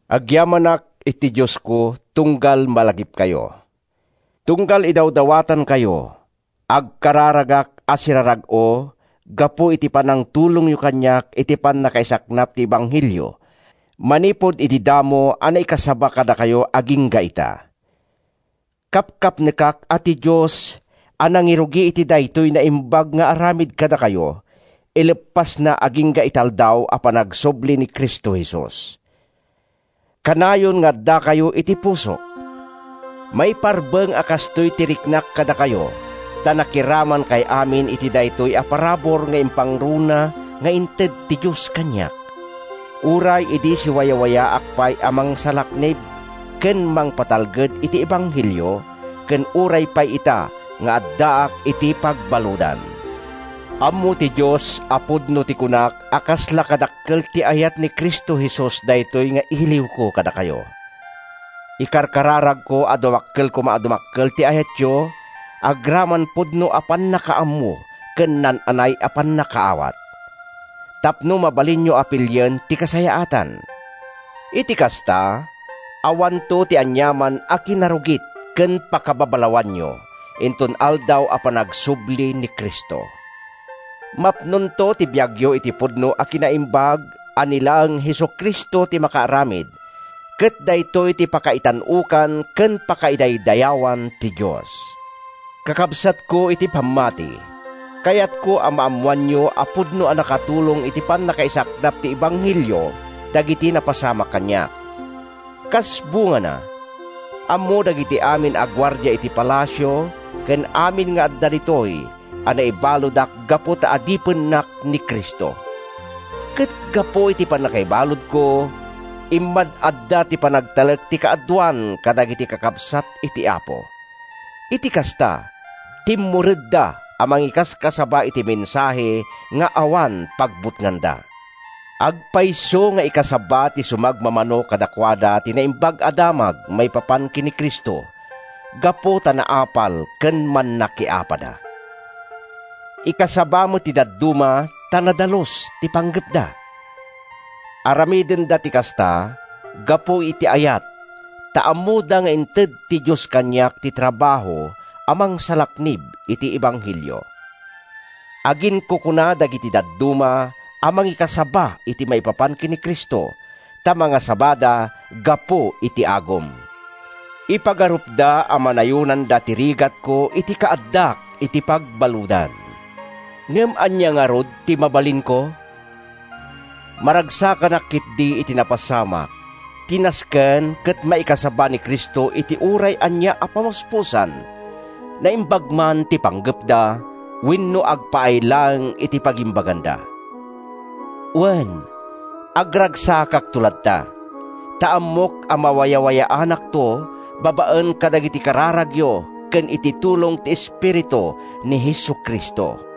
Agyamanak iti Diosko tunggal malagipkayo. Tunggal idawdawatankayo, agkararagak a sirarag-o gapu iti panangtulongyo kaniak iti pannakaisaknap ti ebanghelio manipud idi damo a naikasaba kadakayo agingga ita. Kapkapnekak a ti Dios a nangirugi iti daytoy naimbag nga aramid kadakayo, ileppasna agingga iti Aldaw a panagsubli ni Cristo Jesus. Kanayon nga addakayo iti pusok. Maiparbeng a kastoy ti riknak kadakayo ta nakiramankay amin iti daytoy a parabur nga impangruna nga inted ti Dios kaniak, uray idi siwayawayaak pay a mangsalaknib ken mangpatalged iti ebanghelio, ken uray pay ita nga addaak iti pagbaludan. Ammo ti Dios a pudno ti kunak a kasla kadakkel ti ayat ni Cristo Jesus daytoy nga iliwko kadakayo. Ikararagko a dumakkel koma a dumakkel ti ayatyo agraman pudno a pannakaammo ken naan-anay a pannakaawat tapno mabalinyo a pilien ti kasayaatan. Iti kasta, awanto ti aniaman a kinarugit ken pakababalawanyo inton Aldaw a panagsubli ni Cristo. Mapnonto ti biagyo iti pudno a kinaimbag a ni laeng Jesu-Cristo ti makaaramid ket daytoy ti pakaitan-okan ken pakaidaydayawan ti Dios. Kakabsatko iti pammati, kayatko a maammoanyo a pudno a nakatulong iti pannakaisaknap ti ebanghelio dagiti napasamak kaniak. Kas bungana, ammo dagiti amin a guardia iti palasio ken amin nga adda ditoy a naibaludak gapu ta adipennak ni Cristo. Ket gapu iti pannakaibaludko, immad-adda ti panagtalek ti kaaduan kadagiti kakabsat iti Apo. Iti kasta, timmuredda a mangikaskasaba iti mensahe nga awan pagbutnganda. Agpayso nga ikasaba ti sumagmamano kadakuada ti naimbag a damag maipapan ken ni Cristo gapu ta naapal ken mannakiapada. Ikasaba met ti dadduma ta nadalus ti panggepda. Aramidenda ti kasta gapu iti ayat, ta ammoda nga inted ti Dios kaniak ti trabaho a mangsalaknib iti ebanghelio. Aginkukuna dagiti dadduma a mangikasaba iti maipapan ken ni Cristo, ta mangasabada gapu iti agum. Ipagarupda a manayonanda ti rigatko iti kaaddak iti pagbaludan. Ngem ania ngarud ti mabalinko? Maragsakanak ketdi iti napasamak—ti nasken ket maikasaba ni Cristo iti uray ania a pamuspusan, naimbag man ti panggepda wenno agpaay laeng iti pagimbaganda. Wen, agragsakakto latta, ta ammok a mawayawayaanakto babaen kadagiti kararagyo ken iti tulong ti Espiritu ni Jesu-Cristo.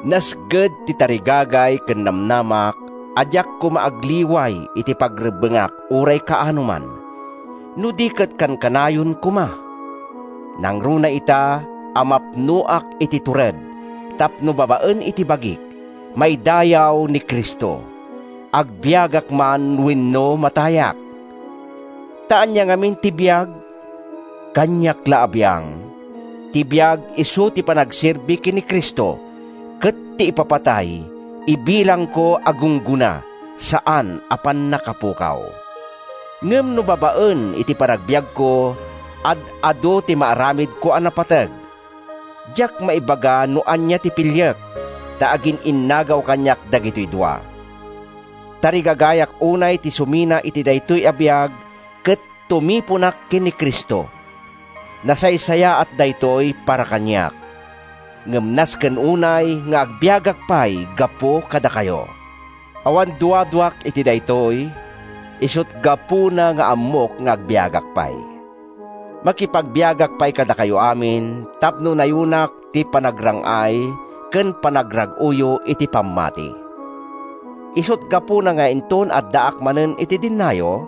Nasged ti tarigagay ken namnamak a diak koma agliway iti pagrebbengak uray kaanoman, no di ket kankanayon koma, nangruna ita, a mapnoak iti tured, tapno babaen iti bagik, maidayaw ni Cristo, agbiagak man wenno matayak. Ta ania ngamin ti biag? Kaniak la a biang, ti biag isu ti panagserbi ken ni Cristo ket ti ipapatay ibilangko a gunggona, saan a pannakapukaw. Ngem no babaen iti panagbiagko, ad-adu ti maaramidko a napateg, diak maibaga no ania ti piliek ta agin-innagaw kaniak dagitoy dua. Tarigagayak unay ti sumina iti daytoy a biag ket tumiponak ken ni Cristo—nasaysayaat daytoy para kaniak. Ngem nasken unay nga agbiagak pay gapu kadakayo. Awan duaduak iti daytoy; isut’ gapuna nga ammok nga agbiagak pay. Makipagbiagak pay kadakayo amin tapno nayonak ti panagrang-ay ken panagrag-oyo iti pammati. Isut’ gapuna nga inton addaak manen iti dennayo,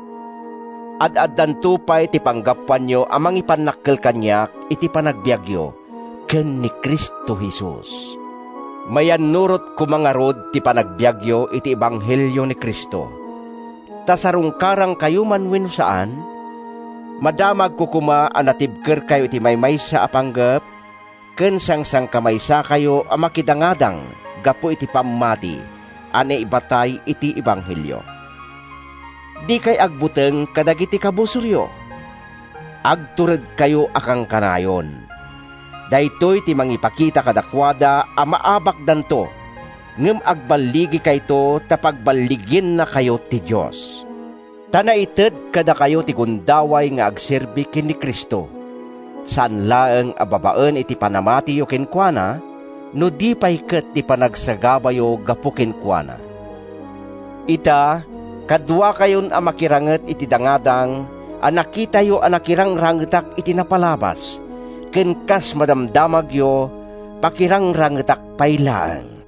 ad-addanto pay ti panggapuanyo a mangipannakkel kaniak iti panagbiagyo ken ni Cristo Jesus. Mayannurot koma ngarud ti panagbiagyo iti ebanghelio ni Cristo, ta sarungkarankayo man wenno saan, madamagko koma a natibkerkayo iti maymaysa a panggep, ken sangsangkamaysakayo a makidangadang gapu iti pammati a naibatay iti ebanghelio. Dikay agbuteng kadagiti kabusoryo. Agturedkayo a kankanayon. Daytoy ti mangipakita kadakuada a maabakdanto, ngem agballigikayto ta pagballigiennakayo ti Dios! Ta naited kadakayo ti gundaway nga agserbi ken ni Cristo, saan laeng a babaen iti panamatiyo kenkuana, no di pay ket iti panagsagabayo gapu kenkuana. Ita, kaduakayon a makiranget iti dangadang a nakitayo a nakirangrangetak iti napalabas ken, kas madamdamagyo, pakirangrangetak pay laeng.